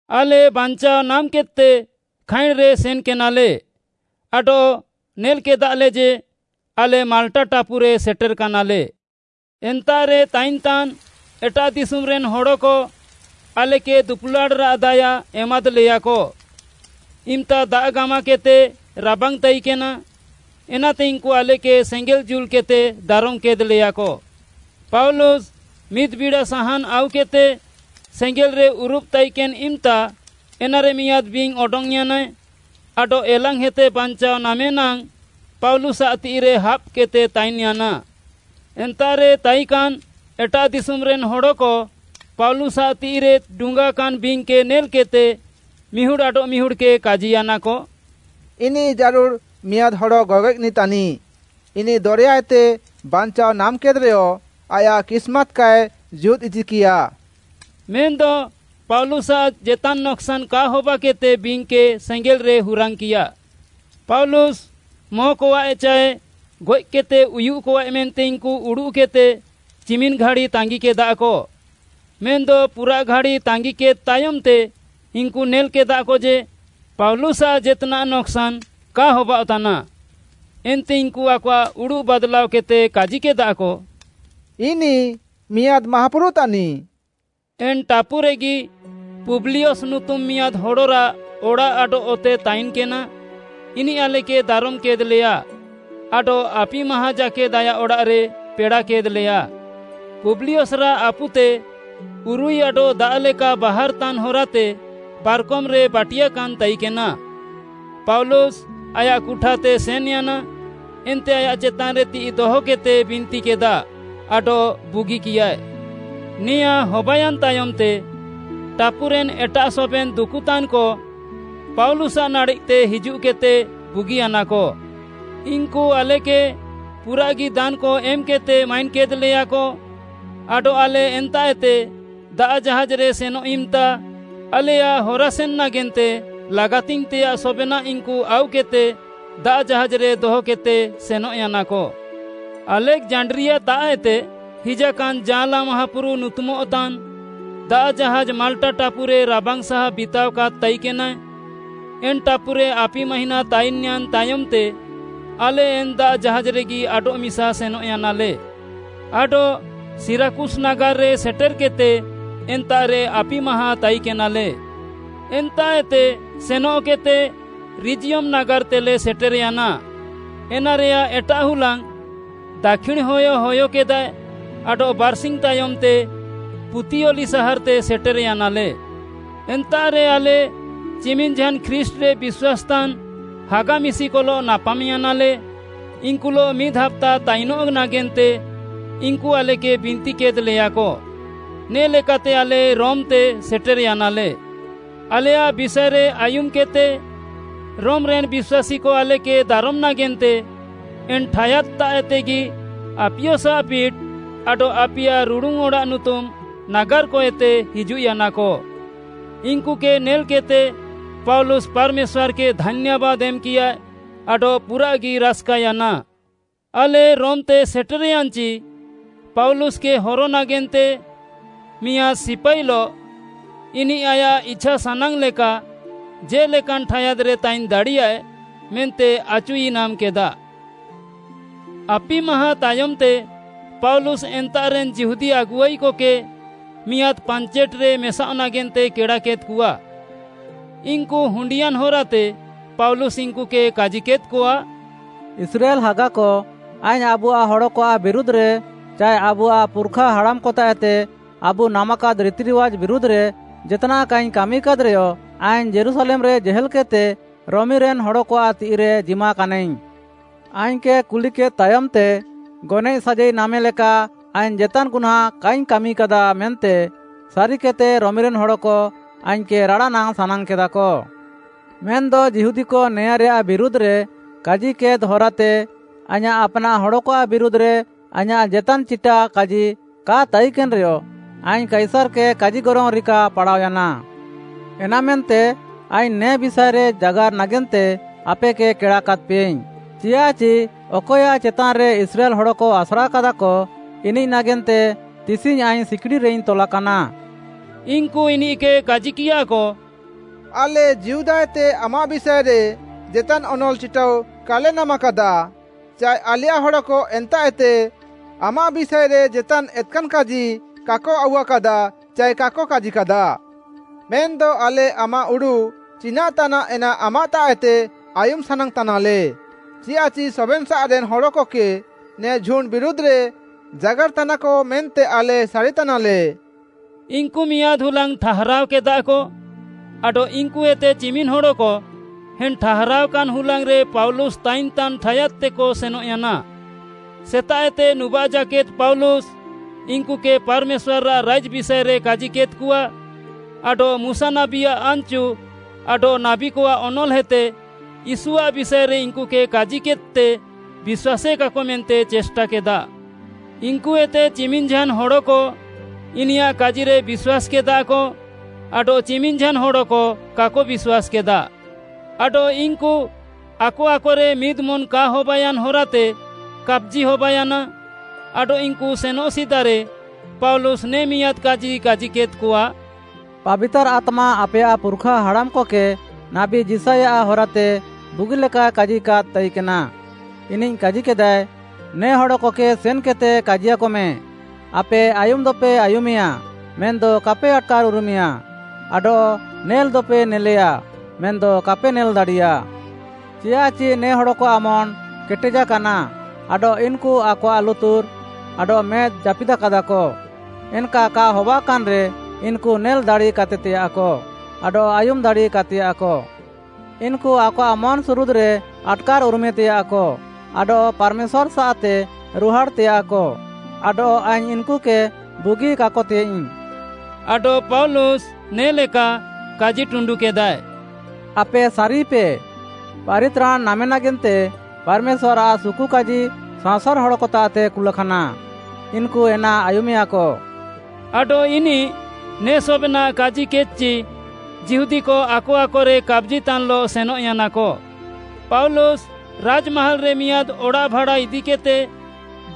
ଆଲେ ବାଞ୍ଚାଅ ନାମ୍‌କେଦ୍‌ତେ ଖାଇଁଣ୍‌ରେ ସେନ୍‌କେନାଲେ ଆଡଃ ନେଲ୍‌କେଦାଲେ ଯେ, ଆଲେ ମାଲ୍‌ଟା ଟାପୁରେ ସେଟେର୍‌କାନାଲେ। ଏନ୍ତାଃରେ ତାଇନ୍‌ତାନ୍‌ ଏଟାଃ ଦିଶୁମ୍‌ରେନ୍‌ ହଡ଼କ ଆଲେକେ ଦୁପୁଲାଡ଼୍‌ରାଃ ଦାୟା ଏମାଦ୍‌ଲେୟାକ। ଇମ୍‌ତା ଦାଆଃ ଗାମାକେଦ୍‌ତେ ରାବାଙ୍ଗ୍‌ତାଇକେନା, ଏନାତେ ଇନ୍‌କୁ ଆଲେକେ ସେଙ୍ଗେଲ୍‌ ଜୁଲ୍‌କେଦ୍‌ତେ ଦାରମ୍‌କେଦ୍‌ଲେୟାକ। ପାଉଲୁସ୍‌ ମିଦ୍‌ ବିଡ଼ା ସାହାନ୍‌ ଆଉକେଦ୍‌ତେ ସେଙ୍ଗେଲ୍‌ରେ ଉରୁବ୍‌ ତାଇକେନ୍‌ ଇମ୍‌ତା, ଏନାରେ ମିଆଁଦ୍‌ ବିଙ୍ଗ୍‌ ଅଡଙ୍ଗ୍‌ୟାନାଏ ଆଡଃ ଏଲାଙ୍ଗ୍‌ହେତେ ବାଞ୍ଚାଅ ନାମେ ନାଙ୍ଗ୍‌ ପାଉଲୁସ୍‌ଆଃ ତିଃଇରେ ହାବ୍‌କେଦ୍‌ତେ ତାଇନ୍‌ୟାନା। ଏନ୍ତାଃରେ ତାଇକାନ୍‌ ଏଟାଃ ଦିଶୁମ୍‌ରେନ୍‌ ହଡ଼କ ପାଉଲୁସ୍‌ଆଃ ତିଃଇରେ ଡୁଙ୍ଗାକାନ୍‌ ବିଙ୍ଗ୍‌କେ ନେଲ୍‌କେଦ୍‌ତେ ମିହୁଡ଼୍‌ ଆଡଃମିହୁଡ଼୍‌କେ କାଜିୟାନାକ, “ଇନିଃ ଜାରୁଡ଼୍‌ ମିଆଁଦ ହଡ଼ ଗଗଏଃନିଃ ତାନିଃ, ଇନିଃ ଦରେୟାଏତେ ବାଞ୍ଚାଅ ନାମ୍‌କେଦ୍‌ରେୟ ଆୟାଃ କିସ୍‌ମାତ୍‌ କାଏ ଜୀହୁଦ୍‌ଇଚିକିୟା।” ମେନ୍‌ଦ ପାଉଲୁସ୍‌ଆଃ ଜେତାନ୍‌ ନକ୍‌ସାନ୍‌ କା ହବାକେଦ୍‌ତେ ବିଙ୍ଗ୍‌କେ ସେଙ୍ଗେଲ୍‌ରେ ହୁରାଙ୍ଗ୍‌କିୟା। ପାଉଲୁସ୍‌ ମଁକଆଃଏ ଚାଏ ଗଏଃକେଦ୍‌ତେ ଉୟୁଃକଆଃଏ ମେନ୍ତେ ଇନ୍‌କୁ ଉଡ଼ୁଃକେଦ୍‌ତେ ଚିମିନ୍‌ଘାଡ଼ି ତାଙ୍ଗିକେଦାକ। ମେନ୍‌ଦ ପୁରାଃଘାଡ଼ି ତାଙ୍ଗିକେଦ୍‌ ତାୟମ୍‌ତେ ଇନ୍‌କୁ ନେଲ୍‌କେଦାକ ଯେ, ପାଉଲୁସ୍‌ଆଃ ଜେତ୍‌ନାଃ ନକ୍‌ସାନ୍‌ କା ହବାଅଃତାନା, ଏନ୍ତେ ଇନ୍‌କୁ ଆକଆଃ ଉଡ଼ୁଃ ବାଦ୍‌ଲାଅକେଦ୍‌ତେ କାଜିକେଦାକ, “ଇନିଃ ମିଆଁଦ୍‌ ମାହାପୁରୁ ତାନିଃ।” ଏନ୍‌ ଟାପୁରେଗି ପୁବ୍ଲିୟସ୍‌ ନୁତୁମ୍‌ ମିଆଁଦ୍‌ ହଡ଼ରାଃ ଅଡ଼ାଃ ଆଡଃ ଅତେ ତାଇନ୍‌କେନା। ଇନିଃ ଆଲେକେ ଦାରମ୍‌କେଦ୍‌ଲେୟା ଆଡଃ ଆପିମାହାଁ ଜାକେଦ୍‌ ଆୟାଃ ଅଡ଼ାଃରେ ପେଡ଼ାକେଦ୍‌ଲେୟା। ପୁବ୍ଲିୟସ୍‌ରାଃ ଆପୁତେ ଉରୁଇ ଆଡଃ ଦାଆଃ ଲେକା ବାହାର୍‌ତାନ୍‌ ହରାତେ ପାର୍‌କମ୍‌ରେ ବାଟିୟାକାନ୍‌ ତାଇକେନା। ପାଉଲୁସ୍‌ ଆୟାଃ କୁଠାତେ ସେନ୍‌ୟାନା, ଏନ୍ତେ ଆୟାଃ ଚେତାନ୍‌ରେ ତିଃଇ ଦହକେଦ୍‌ତେ ବିନ୍ତିକେଦା ଆଡଃ ବୁଗିକିୟାଏ। ନେଆଁଁ ହବାୟାନ୍‌ ତାୟମ୍‌ତେ ଟାପୁରେନ୍ ଏଟାଃ ସବେନ୍‌ ଦୁକୁତାନ୍‌କ ପାଉଲୁସ୍‌ଆଃ ନାଡ଼େଃତେ ହିଜୁଃକେଦ୍‌ତେ ବୁଗିୟାନାକ। ଇନ୍‌କୁ ଆଲେକେ ପୁରାଃଗି ଦାନ୍‌କ ଏମ୍‌କେଦ୍‌ତେ ମାଇନ୍‌କେଦ୍‌ଲେୟାକ। ଆଡଃ ଆଲେ ଏନ୍ତାଃଏତେ ଦାଆଃ ଜାହାଜ୍‌ରେ ସେନଃ ଇମ୍‌ତା ଆଲେୟାଃ ହରାସେନ୍‌ ନାଗେନ୍ତେ ଲାଗାତିଙ୍ଗ୍‌ତେୟାଃ ସବେନାଃ ଇନ୍‌କୁ ଆଉକେଦ୍‌ତେ ଦାଆଃ ଜାହାଜ୍‌ରେ ଦହକେଦ୍‌ତେ ସେନଃୟାନାକ। ଆଲେକ୍‌ଜାଣ୍ଡ୍ରିଆତାଃଏତେ ହିଜାକାନ୍‌ “ଜାଅଁଲା ମାହାପୁରୁ” ନୁତୁମଃତାନ୍‌ ଦାଆଃ ଜାହାଜ୍‌ ମାଲ୍‌ଟା ଟାପୁରେ ରାବାଙ୍ଗ୍‌ସାହା ବିତାଅକାଦ୍‌ ତାଇକେନାଏ। ଏନ୍‌ ଟାପୁରେ ଆପି ମାହିଁନା ତାଇନ୍‌ୟାନ୍‌ ତାୟମ୍‌ତେ, ଆଲେ ଏନ୍‌ ଦାଆଃ ଜାହାଜ୍‌ରେଗି ଆଡଃମିସା ସେନଃୟାନାଲେ। ଆଡଃ ସିରାକୁସ୍‌ ନାଗାର୍‌ରେ ସେଟେର୍‌କେଦ୍‌ତେ, ଏନ୍ତାଃରେ ଆପିମାହାଁ ତାଇକେନାଲେ। ଏନ୍ତାଃଏତେ ସେନଃକେଦ୍‌ତେ ରିଜିୟମ୍‌ ନାଗାର୍‌ତେଲେ ସେଟେର୍‌ୟାନା। ଏନାରେୟାଃ ଏଟାଃ ହୁଲାଙ୍ଗ୍‌ ଦାକ୍ଷିଣ୍‌ ହୟ ହୟକେଦାଏ, ଆଡଃ ବାର୍‌ସିଙ୍ଗ୍‌ ତାୟମ୍‌ତେ ପୁତିଅଲି ସାହାର୍‌ତେ ସେଟେର୍‌ୟାନାଲେ। ଏନ୍ତାଃରେ ଆଲେ ଚିମିନ୍‌ଝାନ୍‌ ଖ୍ରୀଷ୍ଟ୍‌ରେ ବିଶ୍ୱାସ୍‌ତାନ୍‌ ହାଗା ମିଶିକଲଃ ନାପାମ୍‌ୟାନାଲେ। ଇନ୍‌କୁଲଃ ମିଦ୍‌ ହାପ୍ତା ତାଇନଃ ନାଗେନ୍ତେ ଇନ୍‌କୁ ଆଲେକେ ବିନ୍ତିକେଦ୍‌ଲେୟାକ। ନେ'ଲେକାତେ ଆଲେ ରୋମ୍‌ତେ ସେଟେର୍‌ୟାନାଲେ। ଆଲେୟାଃ ବିଷାଏରେ ଆୟୁମ୍‌କେଦ୍‌ତେ ରୋମ୍‌ରେନ୍‌ ବିଶ୍ୱାସୀକ ଆଲେକେ ଦାରମ୍‌ ନାଗେନ୍ତେ ଏନ୍‌ ଠାୟାଦ୍‌ତାଃଏତେଗି ଆପିୟସ୍‌ଆଃ ପିଟ୍‌ ଆଡଃ ଆପିୟା ରୁଡ଼ୁନ୍‌ ଅଡ଼ାଃ ନୁତୁମ୍‌ ନାଗାର୍‌କଏତେ ହିଜୁଃୟାନାକ। ଇନ୍‌କୁକେ ନେଲ୍‌କେଦ୍‌ତେ ପାଉଲୁସ୍‌ ପାର୍‌ମେଶ୍ୱାର୍‌କେ ଧାନ୍ୟାବାଦ୍‌ ଏମ୍‌କିୟାଏ ଆଡଃ ପୁରାଃଗି ରାସ୍‌କାୟାନା। ଆଲେ ରୋମ୍‌ତେ ସେଟେର୍‍ୟାନ୍‍ଚି, ପାଉଲୁସ୍‌କେ ହର ନାଗେନ୍ତେ ମିଆଁଦ୍‌ ସିପାଇଲଃ ଇନିଃ ଆୟାଃ ଇଛାସାନାଙ୍ଗ୍‌ଲେକା ଜେ'ଲେକାନ୍‌ ଠାୟାଦ୍‌ରେ ତାଇନ୍‌ ଦାଡ଼ିୟାଏ ମେନ୍ତେ ଆଚୁଇନାମ୍‌କେଦା। ଆପିମାହାଁ ତାୟମ୍‌ତେ ପାଉଲୁସ୍‍ ଏନ୍ତାଃରେନ୍‌ ଯିହୁଦୀ ଆଗୁଆଇକକେ ମିଆଁଦ୍‌ ପାଞ୍ଚେଟ୍‌ରେ ମେସାଅଃ ନାଗେନ୍ତେ କେଡ଼ାକେଦ୍‌କଆ। ଇନ୍‌କୁ ହୁଣ୍ଡିୟାନ୍‌ ହରାତେ ପାଉଲୁସ୍‌ ଇନ୍‌କୁକେ କାଜିକେଦ୍‌କଆ, “ଇସ୍ରାଏଲ୍‌ ହାଗାକ, ଆଇଙ୍ଗ୍‌ ଆବୁଆଃ ହଡ଼କଆଃ ବିରୁଧ୍‌ରେ ଚାଏ ଆବୁଆଃ ପୁର୍‌ଖା ହଡ଼ାମ୍‌କତାଃଏତେ ଆବୁ ନାମାକାଦ୍‌ ରିତିରିୱାଜ୍‌ ବିରୁଧ୍‌ରେ ଜେତ୍‌ନାଃ କାଇଙ୍ଗ୍‌ କାମିକାଦ୍‌ରେୟ, ଆଇଙ୍ଗ୍‌ ଯୀରୁଶାଲେମ୍‌ରେ ଜେହେଲ୍‌କେଦ୍‌ତେ ରୋମିରେନ୍‌ ହଡ଼କଆଃ ତିଃଇରେ ଜିମାକାନାଇଙ୍ଗ୍‌। ଆଇଙ୍ଗ୍‌କେ କୁଲିକେଦ୍‌ ତାୟମ୍‌ତେ ଗନଏଃ ସାଜାଇ ନାମେ ଲେକା ଆଇଙ୍ଗ୍‌ ଜେତାନ୍‌ ଗୁହ୍ନାଁ କାଇଙ୍ଗ୍‌ କାମିକାଦା ମେନ୍ତେ ସାରିକେଦ୍‌ତେ ରୋମିରେନ୍‌ ହଡ଼କ ଆଇଙ୍ଗ୍‌କେ ରାଡ଼ାନାଙ୍ଗ୍‌ ସାନାଙ୍ଗ୍‌କେଦାକ। ମେନ୍‌ଦ ଯିହୁଦୀକ ନେଆଁରେୟାଃ ବିରୁଧ୍‌ରେ କାଜିକେଦ୍‌ ହରାତେ ଆଇଁୟାଃ ଆପ୍‌ନାଃ ହଡ଼କଆଃ ବିରୁଧ୍‌ରେ ଆଇଁୟାଃ ଜେତାନ୍‌ ଚିଟାକାଜି କା ତାଇକେନ୍‌ରେୟ, ଆଇଙ୍ଗ୍‌ କାଇସାର୍‌କେ କାଜିଗରଙ୍ଗ୍‌ ରିକା ପାଡ଼ାଅୟାନା। ଏନାମେନ୍ତେ ଆଇଙ୍ଗ୍‌ ନେ ବିଷାଏରେ ଜାଗାର୍‌ ନାଗେନ୍ତେ ଆପେକେ କେଡ଼ାକାଦ୍‌ପେୟାଇଙ୍ଗ୍‌। ଚିଆଃଚି ଅକଏୟାଃ ଚେତାନ୍‌ରେ ଇସ୍ରାଏଲ୍‌ ହଡ଼କ ଆସ୍ରାକାଦାକ, ଇନିଃ ନାଗେନ୍ତେ ତିସିଙ୍ଗ୍‌ ଆଇଙ୍ଗ୍‌ ସିକ୍‌ଡ଼ିରେଇଙ୍ଗ୍‌ ତଲାକାନା।” ଇନ୍‌କୁ ଇନିଃକେ କାଜିକିୟାକ, “ଆଲେ ଯିହୁଦାଏତେ ଆମାଃ ବିଷାଏରେ ଜେତାନ୍‌ ଅନଲ୍‌ ଚିଟାଉ କାଲେ ନାମ୍‌କାଦା, ଚାଏ ଆଲେୟାଃ ହଡ଼କ ଏନ୍ତାଃଏତେ ଆମାଃ ବିଷାଏରେ ଜେତାନ୍‌ ଏତ୍‌କାନ୍‌ କାଜି କାକ ଆଉୱାକାଦା ଚାଏ କାକ କାଜିକାଦା। ମେନ୍‌ଦ ଆଲେ ଆମାଃ ଉଡ଼ୁଃ ଚିନାଃ ତାନାଃ ଏନା ଆମାଃତାଃଏତେ ଆୟୁମ୍‌ ସାନାଙ୍ଗ୍‌ତାନାଲେ। ଚିଆଃଚି ସବେନ୍‌ସାଃରେନ୍‌ ହଡ଼କକେ ନେ ଝୁଣ୍ଡ୍‌ ବିରୁଧ୍‌ରେ ଜାଗାର୍‌ତାନାକ ମେନ୍ତେ ଆଲେ ସାରିତାନାଲେ।” ଇନ୍‌କୁ ମିଆଁଦ୍‌ ହୁଲାଙ୍ଗ୍‌ ଠାହାରାଅକେଦାକ ଆଡଃ ଇନ୍‌କୁଏତେ ଚିମିନ୍‌ ହଡ଼କ ଏନ୍‌ ଠାହାରାଅକାନ୍‌ ହୁଲାଙ୍ଗ୍‌ରେ ପାଉଲୁସ୍‌ ତାଇନ୍‌ତାନ୍‌ ଠାୟାଦ୍‌ତେକ ସେନଃୟାନା। ସେତାଃଏତେ ନୁବାଃ ଜାକେଦ୍‌ ପାଉଲୁସ୍‌ ଇନ୍‌କୁକେ ପାର୍‌ମେଶ୍ୱାର୍‌ଆଃ ରାଇଜ୍‌ ବିଷାଏରେ କାଜିକେଦ୍‌କଆ ଆଡଃ ମୁଶା ନାବୀଆଃ ଆନ୍‌ଚୁ ଆଡଃ ନାବୀକଆଃ ଅନଲ୍‌ହେତେ ୟୀଶୁଆଃ ବିଷାଏରେ ଇନ୍‌କୁକେ କାଜିକେଦ୍‌ତେ ବିଶ୍ୱାସେକାକ ମେନ୍ତେ ଚେଷ୍ଟାକେଦା। ଇନ୍‌କୁଏତେ ଚିମିନ୍‌ ଝାନ୍‌ ହଡ଼କ ଇନିୟାଃ କାଜିରେ ବିଶ୍ୱାସ୍‌କେଦାକ ଆଡଃ ଚିମିନ୍‌ ଝାନ୍‌ ହଡ଼କ କାକ ବିଶ୍ୱାସ୍‌କେଦା। ଆଡଃ ଇନ୍‌କୁ ଆକ ଆକରେ ମିଦ୍‌ମନ୍‌ କା ହବାୟାନ୍‌ ହରାତେ କାପ୍‌ଜି ହବାୟାନା, ଆଡଃ ଇନ୍‌କୁ ସେନଃ ସିଦାରେ ପାଉଲୁସ୍‌ ନେ ମିଆଁଦ୍‌ କାଜି କାଜିକେଦ୍‌କଆ, “ପାବିତାର୍‌ ଆତ୍ମା ଆପେୟାଃ ପୁର୍‌ଖା ହାଡ଼ାମ୍‌କକେ ନାବୀ ଯିଶାୟଆଃ ହରାତେ ବୁଗିଲେକାଏ କାଜିକାଦ୍‌ ତାଇକେନା, ଇନିଃ କାଜିକାଦାଏ, “‘ନେ ହଡ଼କକେ ସେନ୍‌କେଦ୍‌ତେ କାଜିକମେ, ଆପେ ଆୟୁମ୍‌ଦପେ ଆୟୁମେୟା ମେନ୍‌ଦ କାପେ ଆଟ୍‌କାର୍‌ ଉରୁମେୟା, ଆଡଃ ନେଲ୍‌ଦପେ ନେଲ୍‌ୟା ମେନ୍‌ଦ କାପେ ନେଲ୍‌ ଦାଡ଼ିୟା, ଚିଆଃଚି ନେ ହଡ଼କଆଃ ମନ୍‌ କେଟେଦ୍‌ୟାକାନା, ଆଡଃ ଇନ୍‌କୁ ଆକଆଃ ଲୁତୁର୍‍ ଆଡଃ ମେଦ୍‌ ଜାପିଦାକାଦାକ, ଏନ୍‌କା କା ହବାକାନ୍‌ରେ ଇନ୍‌କୁ ନେଲ୍‌ ଦାଡ଼ିକାତେୟାଃକ ଆଡଃ ଆୟୁମ୍‌ ଦାଡ଼ିକାତେୟାଃକ। ଇନ୍‌କୁ ଆକଆଃ ମନ୍‌ସୁରୁଦ୍‌ରେ ଆଟ୍‌କାର୍‌ ଉରୁମେତେୟାଃକ, ଆଡଃ ପାର୍‌ମେଶ୍ୱାର୍‌ସାଃତେ ରୁହାଡ଼ଃତେୟାଃକ ଆଡଃ ଆଇଙ୍ଗ୍‌ ଇନ୍‌କୁକେ ବୁଗିକାକତେୟାଃଇଙ୍ଗ୍‌।’” ଆଡଃ ପାଉଲୁସ୍‌ ନେ'ଲେକା କାଜିଟୁଣ୍ଡୁକେଦାଏ, “ଆପେ ସାରିପେ, ପାରିତ୍ରାଣ୍‌ ନାମେ ନାଗେନ୍ତେ ପାର୍‌ମେଶ୍ୱାର୍‌ଆଃ ସୁକୁକାଜି ସାଅଁସାର୍‌ ହଡ଼କତାଃତେ କୁଲାକାନା। ଇନ୍‌କୁ ଏନା ଆୟୁମେୟାକ।” ଆଡଃ ଇନିଃ ନେ ସବେନାଃ କାଜିକେଦ୍‌ଚି ଯିହୁଦୀକ ଆକ ଆକରେ କାପ୍‌ଜିତାନ୍‌ଲଃ ସେନଃୟାନାକ। ପାଉଲୁସ୍‌ ରାଜ୍‌ମାହାଲ୍‌ରେ ମିଆଁଦ୍‌ ଅଡ଼ାଃ ଭାଡ଼ା ଇଦିକେଦ୍‌ତେ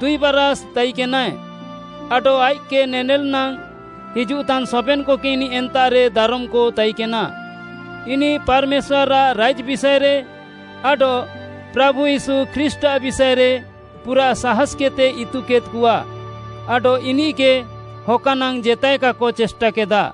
ଦୁଇ ବାରାଷ୍‌ ତାଇକେନାଏ, ଆଡଃ ଆଇଃକ୍‌କେ ନେନେଲ୍‌ ନାଙ୍ଗ୍‌ ହିଜୁଃତାନ୍‌ ସବେନ୍‌କକେ ଇନିଃ ଏନ୍ତାଃରେ ଦାରମ୍‌କ ତାଇକେନା। ଇନିଃ ପାର୍‌ମେଶ୍ୱାର୍‌ଆଃ ରାଇଜ୍‌ ବିଷାଏରେ ଆଡଃ ପ୍ରାଭୁ ୟୀଶୁ ଖ୍ରୀଷ୍ଟ୍‌ଆଃ ବିଷାଏରେ ପୁରା ସାହାସ୍‌କେଦ୍‌ତେ ଇତୁକେଦ୍‌କଆ ଆଡଃ ଇନିଃକେ ହକା ନାଙ୍ଗ୍‌ ଜେତାଏ କାକ ଚେଷ୍ଟାକେଦା।